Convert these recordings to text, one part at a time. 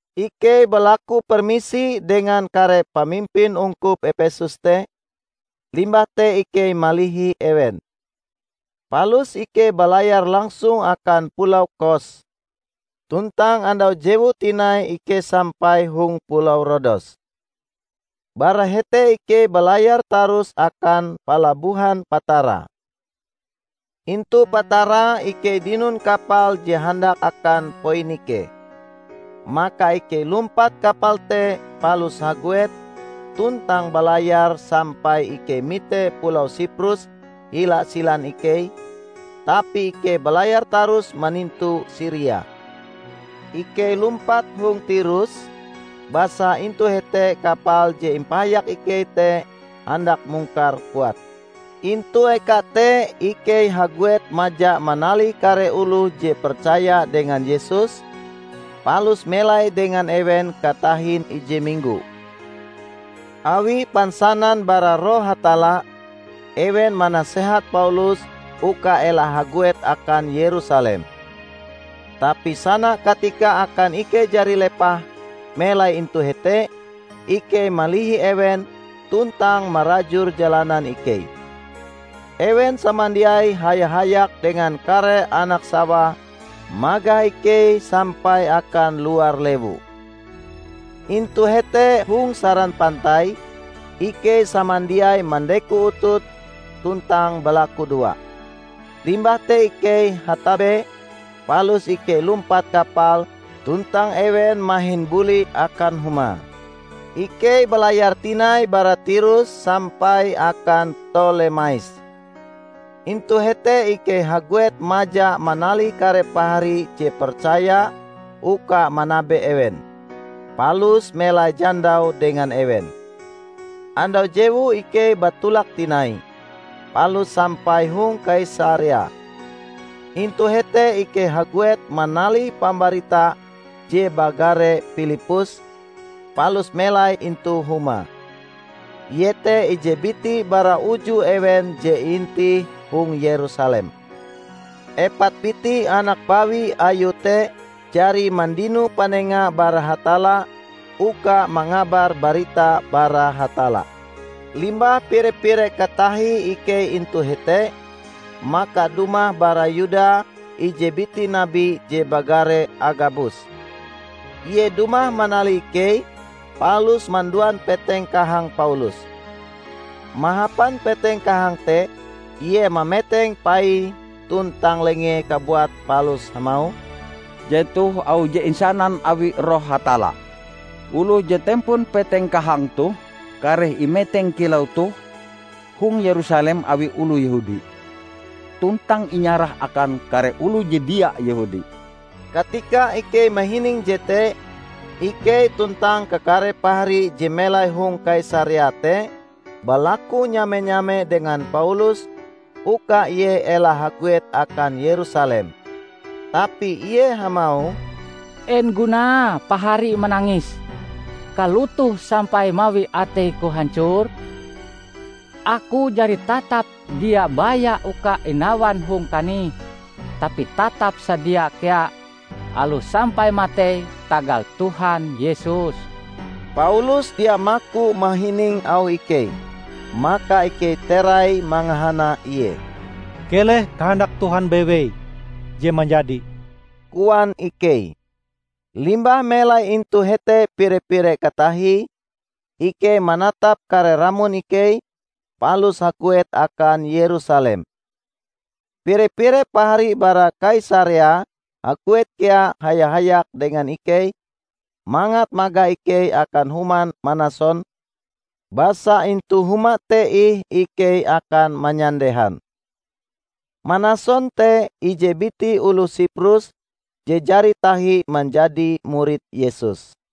Ikei balaku permisi dengan kare pamimpin ungkup Epesus te, limbah te ikei malihi ewen. Palus ikei balayar langsung akan pulau Kos; tuntang andau jewue tinai ikei sampai hong pulau Rodos. Bara hete ikei balayar tarus akan palabohan Patara. Intu Patara ikei dinon kapal je handak akan Poinike. Maka ikei lumpat kapal te palus haguet tuntang balayar sampai ikei mite pulau Siprus hila silan ikei; tapi ikei balayar tarus manintu Siria. Ikei lumpat hong Tirus, basa intu hete kapal je impahayak ikei te handak mungkar puate. Intu eka te ikei haguet maja manalih kare oloh je percaya dengan Yesus, palus melai dengan ewen katahin ije minggo. Awi pansanan bara Roh Hatalla ewen manasehat Paulus uka ela haguet akan Yerusalem. Tapi sana katika akan ikei jari lepah melai intu hete, ikei malihi ewen tuntang marajur jalanan ikei. Ewen samandiai haya-hayak dengan kare anak-sawae magah ikei sampai akan luar lewu. Intu hete hong saran pantai, ikei samandiai mandeko utut tuntang balakudoa. Limbah te ikei hatabe, palus ikei lumpat kapal tuntang ewen mahin buli akan humae. Ikei balayar tinai bara Tirus sampai akan Ptolemais. Intu hete ikei haguet maja manalih kare pahari je percaya uka manabe ewen, palus melai jandau dengan ewen. Andau jewue ikei batolak tinai, palus sampai hong Kaisarea. Intu hete ikei haguet manalih pambarita je bagare Pilippus, palus melai intu humae. Ie te ije biti bara uju ewen je iintih hong Yerusalem. Epat biti anak bawi ayue te jari mandino panenga bara Hatalla uka mangabar barita bara Hatalla. Limbah pire-pire katahie ikei intu hete, maka dumah bara Yuda ije biti nabi je bagare Agabus. Ie dumah manalih ikei palus manduan peteng kahang Paulus. Mahapan peteng kahang te ie mameteng paie tuntang lengee kabuat palus hamauh, "Jetoh auh je insanan awi Roh Hatalla: Oloh je tempon peteng kahang toh kareh imeteng kilau toh hong Yerusalem awi oloh Yehudi tuntang inyarah akan kare oloh je dia Yehudi." Katika ikei mahining jete, ikei tuntang kakare pahari je melai hong Kaisarea te balaku nyame-nyame dengan Paulus uka ie ela haguet akan Yerusalem. Tapi ie hamauh, "En gunae pahari manangis kalotoh sampai mawi ateiku hancor? Aku jari tatap dia baya uka inawan hong kanih, tapi tatap sadia kea aloh sampai matei tagal Tuhan Yesus." Paulus dia maku mahining auh ikei, maka ikei terai mangahana ie. "Keleh kahandak Tuhan bewei je manjadi," koan ikei. Limbah melai intu hete pire-pire katahie, ikei manatap kare ramon ikei, palus haguet akan Yerusalem. Pire-pire pahari bara Kaisarea haguet kea haya-hayak dengan ikei mangat magah ikei akan human Manason, basa intu huma te ih ikei akan manyandehan. (Manason te ije biti oloh Siprus je jari tahi manjadi murid Yesus.)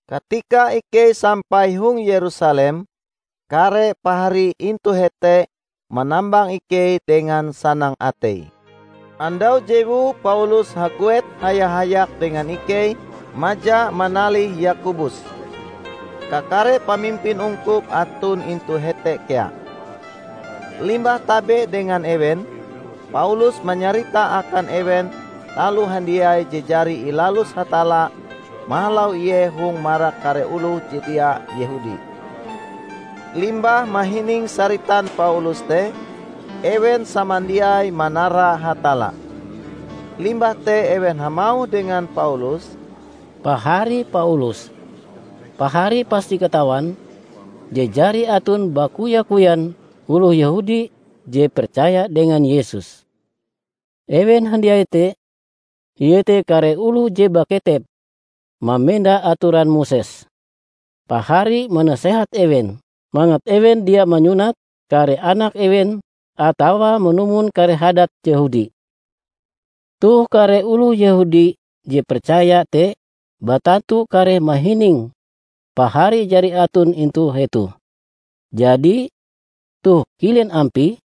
Katika ikei sampai hong Yerusalem, kare pahari intu hete manambang ikei dengan sanang atei. Andau jewue Paulus haguet haya-hayak dengan ikei maja manalih Yakobus; kakare pamimpin ungkup aton intu hete kea. Limbah tabe dengan ewen, Paulus manyarita akan ewen taloh handiai je jari ilalus Hatalla mahalau ie hong marak kare oloh je dia Yehudi. Limbah mahining saritan Paulus te, ewen samandiai manara Hatalla. Limbah te ewen hamauh dengan Paulus, "Pahari Paulus! Pahari pasti katawan je jari aton bakoya-koyan oloh Yehudi je percaya dengan Yesus. Ewen handiai te iete kare oloh je baketep mamenda atoran Moses. Pahari manasehat ewen mangat ewen dia manyunat kare anak ewen atawa manumon kare hadat Yehudi. Toh kare oloh Yehudi je percaya te batantu kareh mahining pahari jari aton intu hetoh. Jadi, toh kilen ampie?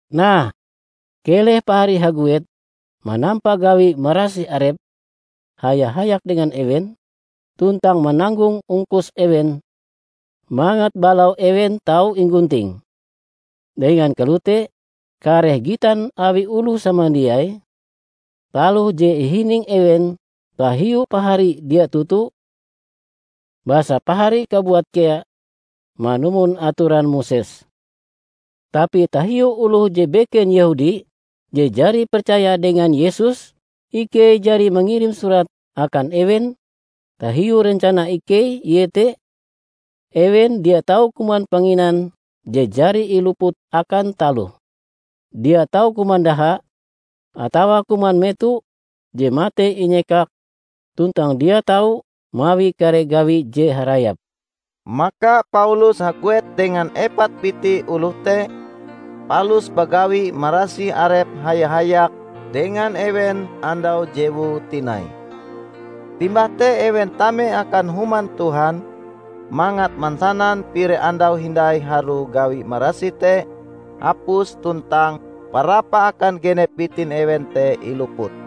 Nah, keleh pahari haguet manampa gawi marasih arep haya-hayak dengan ewen, tuntang mananggong ongkos ewen mangat balau ewen tau inggunting. Dengan kalote kareh gitan awi oloh samandiai taloh je ihining ewen tahiu pahari dia toto, basa pahari kabuat kea manumon atoran Moses. Tapi tahiu oloh je beken Yehudi je jari percaya dengan Yesus, ikei jari mangirim surat akan ewen tahiu rencana ikei iete: ewen dia tau kuman panginan je jari iluput akan taloh, dia tau kuman daha, atawa kuman meto je matei inyekak; tuntang dia tau mawi kare gawi je harayap." Maka Paulus haguet dengan epat biti oloh te palus bagawi marasih arep haya-hayak dengan ewen andau jewue tinai. Limbah te ewen tame akan Human Tuhan mangat mansanan pire andau hindai harue gawi marasih te hapus tuntang parapah akan genep bitin ewen te iluput.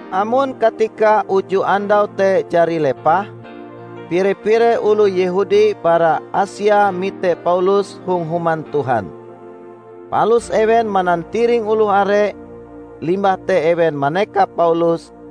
Amon katika uju andau te jari lepah, pire-pire oloh Yehudi bara Asia mite Paulus hong Human Tuhan. Palus ewen manantiring oloh are, limbah te ewen manekap Paulus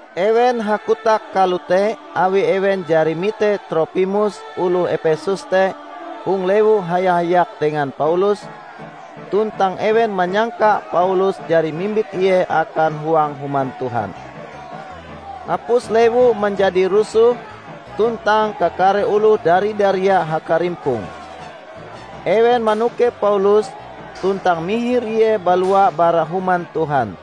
Ewen hakotak kalote awi ewen jari mite Tropimus oloh Epesus te hong lewu haya-hayak dengan Paulus; tuntang ewen manyangka Paulus jari mimbit ie akan huang Human Tuhan.) Hapus lewu manjadi rusoh tuntang kakare oloh dari-daria hakarimpong. Ewen manokep Paulus tuntang mihir ie balua bara Human Tuhan.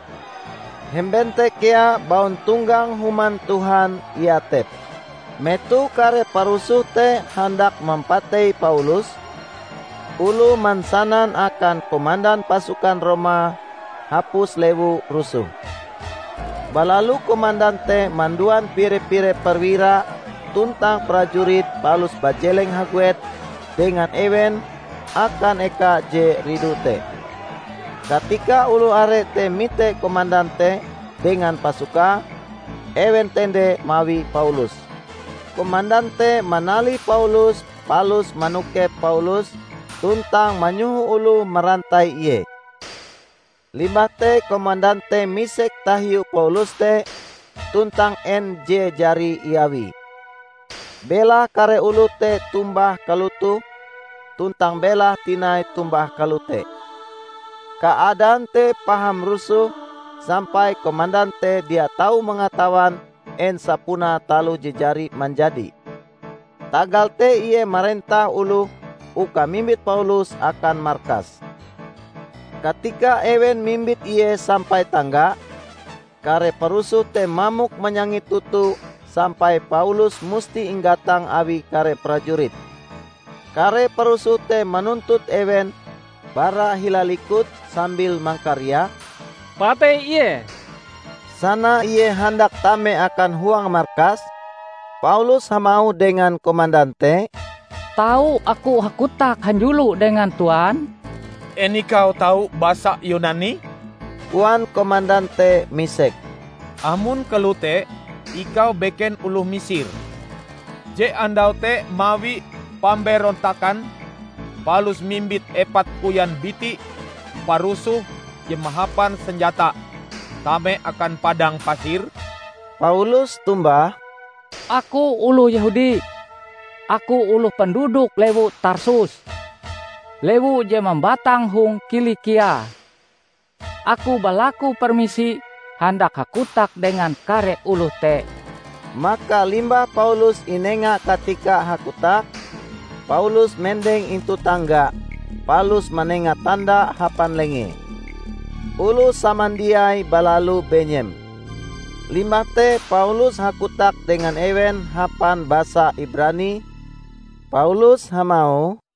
Hemben te kea bauntonggang Human Tuhan iatep. Metoh kare parusoh te handak mampatei Paulus, oloh mansanan akan komandan pasukan Roma hapus lewu rusoh. Balalu komandan te manduan pire-pire perwira tuntang prajurit palus bajeleng haguet dengan ewen akan eka je ridu te. Katika oloh are te mite komandan te dengan pasukae, ewen tende mawi Paulus. Komandan te manalih Paulus palus manokep Paulus, tuntang manyoho oloh marantai ie. Limbah te komandan te misek tahiu Paulus te tuntang en je jari iawie. Belahe kare oloh te tombah kalotoh tuntang belahe tinai tombah kalote. Kaadaan te paham rusoh sampai komandan te dia tau mangatawan en sapunae taloh je jari manjadi. Tagal te ie marentah oloh uka mimbit Paulus akan markas. Katika ewen mimbit ie sampai tangga, kare parusoh te mamok manyangit toto sampai Paulus musti inggatang awi kare prajurit. Kare parusoh te manuntut ewen bara hila likut sambil mangkariak, "Patei ie!" Sana ie handak tame akan huang markas, Paulus hamauh dengan komandan te, "Tau aku hakotak hanjulo dengan Tuan?" "En ikau tau basa Yunani?" koan komandan te misek. "Amon kalote ikau beken oloh Misir je andau te mawi pamberontakan palus mimbit epat koyan biti parusoh je mahapan senjata tame akan padang pasir?" Paulus tombah, "Aku oloh Yehudi; aku oloh penduduk lewu Tarsus, lewu je mambatang hong Kilikia. Aku balaku permisi handak hakotak dengan kare oloh te." Maka limbah Paulus inenga katika hakotak, Paulus mendeng intu tangga, palus manenga tanda hapan lengee. Oloh samandiai balalu benyem. Limbah te Paulus hakotak dengan ewen hapan basa Ibrani, Paulus hamauh,